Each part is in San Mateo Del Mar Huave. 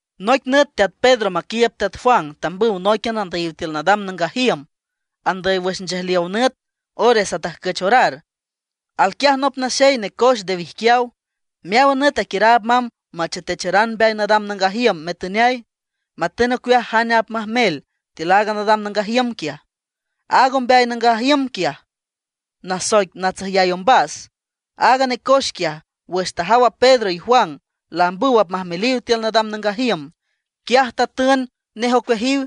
Noic nüt teat Pedro maquiiüb teat Juan tambüw nóiquian andüyiw tiül nadam nangaj iüm, andüy wüx nchejliow nüt, ores atajcüch orar. Alquiaj nop naxey necoex nde wijquiaw. Meáwan nüt aquiüraab mamb machetecharan mbeay nadam nangaj iüm metüneay, matün ocueaj jane apmajmel tiül a nadam nangaj iüm. Aaga ombeay nangaj iüm quiaj nasoic Natsajüy Ombas. Aaga necoex quiaj, wüx tajaw a Pedro y Juan laambüw apmajmeliw tiül nadam nangaj iüm, quiaj tatün nej ocueajiw.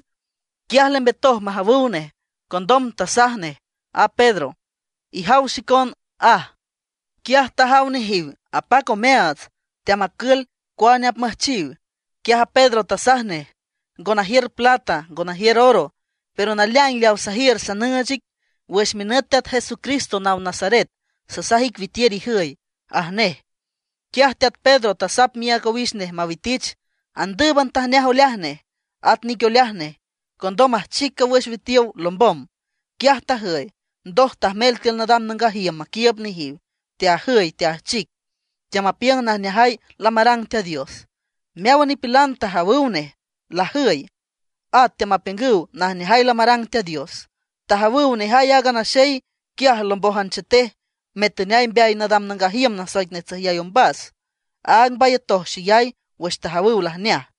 Quiaj lembetoj majawüw nej. Condom tasaj nej a Pedro: ―Ijaw xicon ―aj. Quiaj tajaw nejiw apac omeaats, teamacül cuane apmüjchiw. Quiaj a Pedro tasaj nej: ―Ngo najiür plata, ngo najiür oro; pero naleaing leawa sajiür sanüüch ic: wüx minüt Teat Jesucristo naw Nazaret, sasaj ic witiür ijüy ―aj nej. Quiaj teat Pedro tasap miác owix nej mawitich. Andǘüban tajneaj oleaj nej, at nic oleaj nej. Condom ajchic cawüx witiow lombom, quiaj tajüy. Ndoj tajmel tiül nadam nangaj iüm maquiiüb nejiw, teajüy, teajchic, teamapiüng najneajay lamarang Teat Dios. Meáwan nipilan tajawüw nej lajüy, at teamapiüng najneajay lamarang Teat Dios. Tajawüw nejay aaga naxey quiaj lambójan chetej metüneay mbeay nadam nangaj iüm nasoic Natsajüy Ombas, áag mbayatoj xeyay wüx tajawüw lajneaj.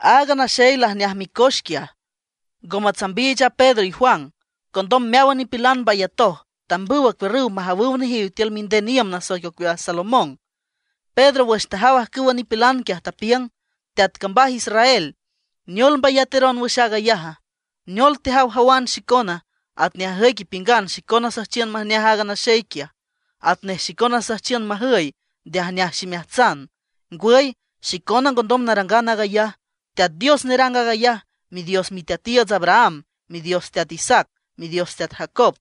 Aaga naxey lajneaj micoex quiaj, ngo matsambiich a Pedro y Juan. Condom meáwan nipilan mbayatoj, tambüw acuiürrüw majawüw nejiw tiül minden iüm nasoic ocueaj Salomón. Pedro wüx tajaw ajcüwa nipilan quiaj, tapiüng: ―Teat cambaj Israel, ¿Neol mbayateron wüx aag ayaja? ¿Neol tejawjawan xicona? Atnej ajüic ipiüngan xicona süjchiün majneaj aaga naxey quiaj, atnej xicona süjchiün majüy nde ajneaj ximeajtsan. Ngwüy, xicona ngondom narangan aag ayaj. Teat Dios nerang aag ayaj, Midios miteatiiüts Abraham, Midios teat Isaac, Midios teat Jacob,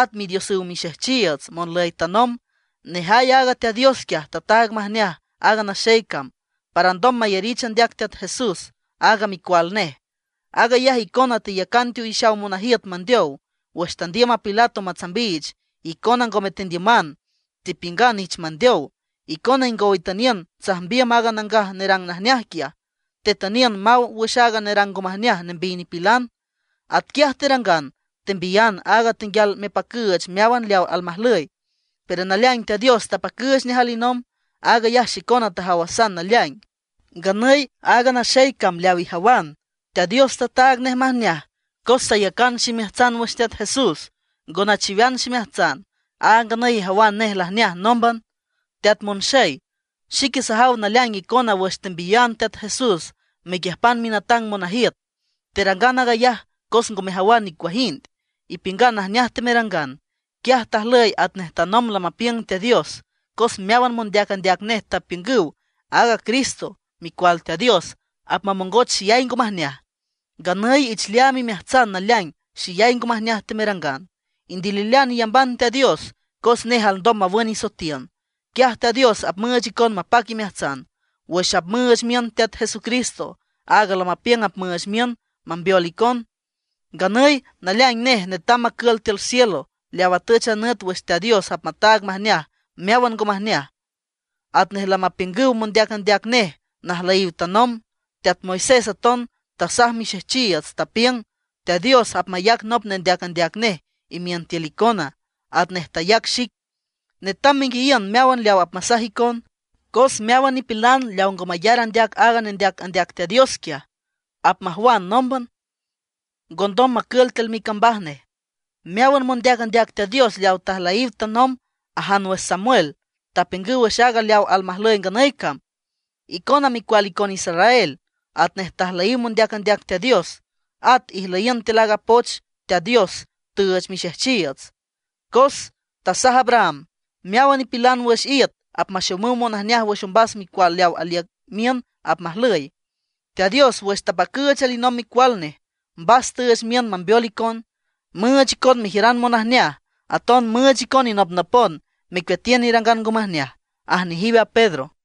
at Midiosüw mixejchiiüts monlüy tanomb. Nejay aaga Teat Dios quiaj tataag majneaj aaga naxey cam, para alndom mayarich andeac Teat Jesús, aaga Micual Nej. Aag ayaj icona teyacan teowix monajiüt mandeow. Wüx tandiüm a Pilato matsambiich, icona ngome tendiüman, tepiüngan ich mandeow. Icona ingow itüniün tsajmbiüm aaga nangaj nerang najneaj quiaj, tetüniün maw wüx aaga nerang ngo majneaj nembiy nipilan. Atquiaj terangan, tembiyan aaga tenguial mepacüüch meáwan leaw almajlüy. Pero naleaing Teat Dios tapacüüch nej alinomb. Aag ayaj xicona tajawasan naleaing. Nganüy aaga naxey cam leaw ijawan, Teat Dios tataag nej majneaj, cos sayacan ximeajtsan wüx Teat Jesús, ngo nachiwean ximeajtsan. Áag nganüy ijawan nej lajneaj nómban. ’Teat monxey, xique sajaw naleaing icona wüx tembiyan Teat Jesús mequiüjpan minatangan monajiüt, terangan aag ayaj cos ngo mejawan nicuajind; ipiüngan najneaj temerangan. Quiaj tajlüy atnej tanomb lamapiüng Teat Dios. Cos meáwan mondeac andeac nej tapiüngüw aaga Cristo, Micual Teat Dios, apmamongoch xeyay ngo majneaj. Nganüy ich leaam imeajtsan naleaing xeyay ngo majneaj temerangan. Indililean iyamban Teat Dios cos nej alndom mawün isoetiün. Quiaj Teat Dios apmüüch icon mapac imeajtsan, wüx apmüüch miün Teat Jesucristo, aaga lamapiüng apmüüch miün mambeol icon. Nganüy naleaing nej netam macül tiül cielo, leaw atüch a nüt wüx Teat Dios apmataag majneaj meáwan ngo majneaj, atnej lamapiüngüw mondeac andeac nej najlüyiw tanomb. Teat Moisés aton tasaj mixejchiiüts, tapiüng: “Teat Dios apmayac nop nendeac andeac nej imiün tiül icona, atnej tayac xic. Netam menguiayiün meáwan leaw apmasaj icon. Cos meáwan nipilan leaw ngo mayar andeac aaga nendeac andeac Teat Dios quiaj, apmajwan nómban, ngondom macül tiül micambaj nej.” ’Meáwan mondeac andeac Teat Dios leaw tajlüyiw tanomb ajan wüx Samuel tapiüngüw wüx aaga leaw almajlüy nganüy cam. Icona micual icon Israel, atnej tajlüyiw mondeac andeac Teat Dios. At ijlüyiün tiül aaga poch Teat Dios tüüch mixejchiiüts, cos tasaj Abraham: “Meáwan nipilan wüx iüt apmaxomüw monajneaj wüx ombas micual leaw aliüc miün apmajlüy.” Teat Dios wüx tapacüüch alinomb Micual Nej, mbas tüüch miün mambeol icon, müüch icon mejiüran monajneaj; aton müüch icon inopnopon mecueatiün irangan ngo majneaj ―aj nejiw a Pedro.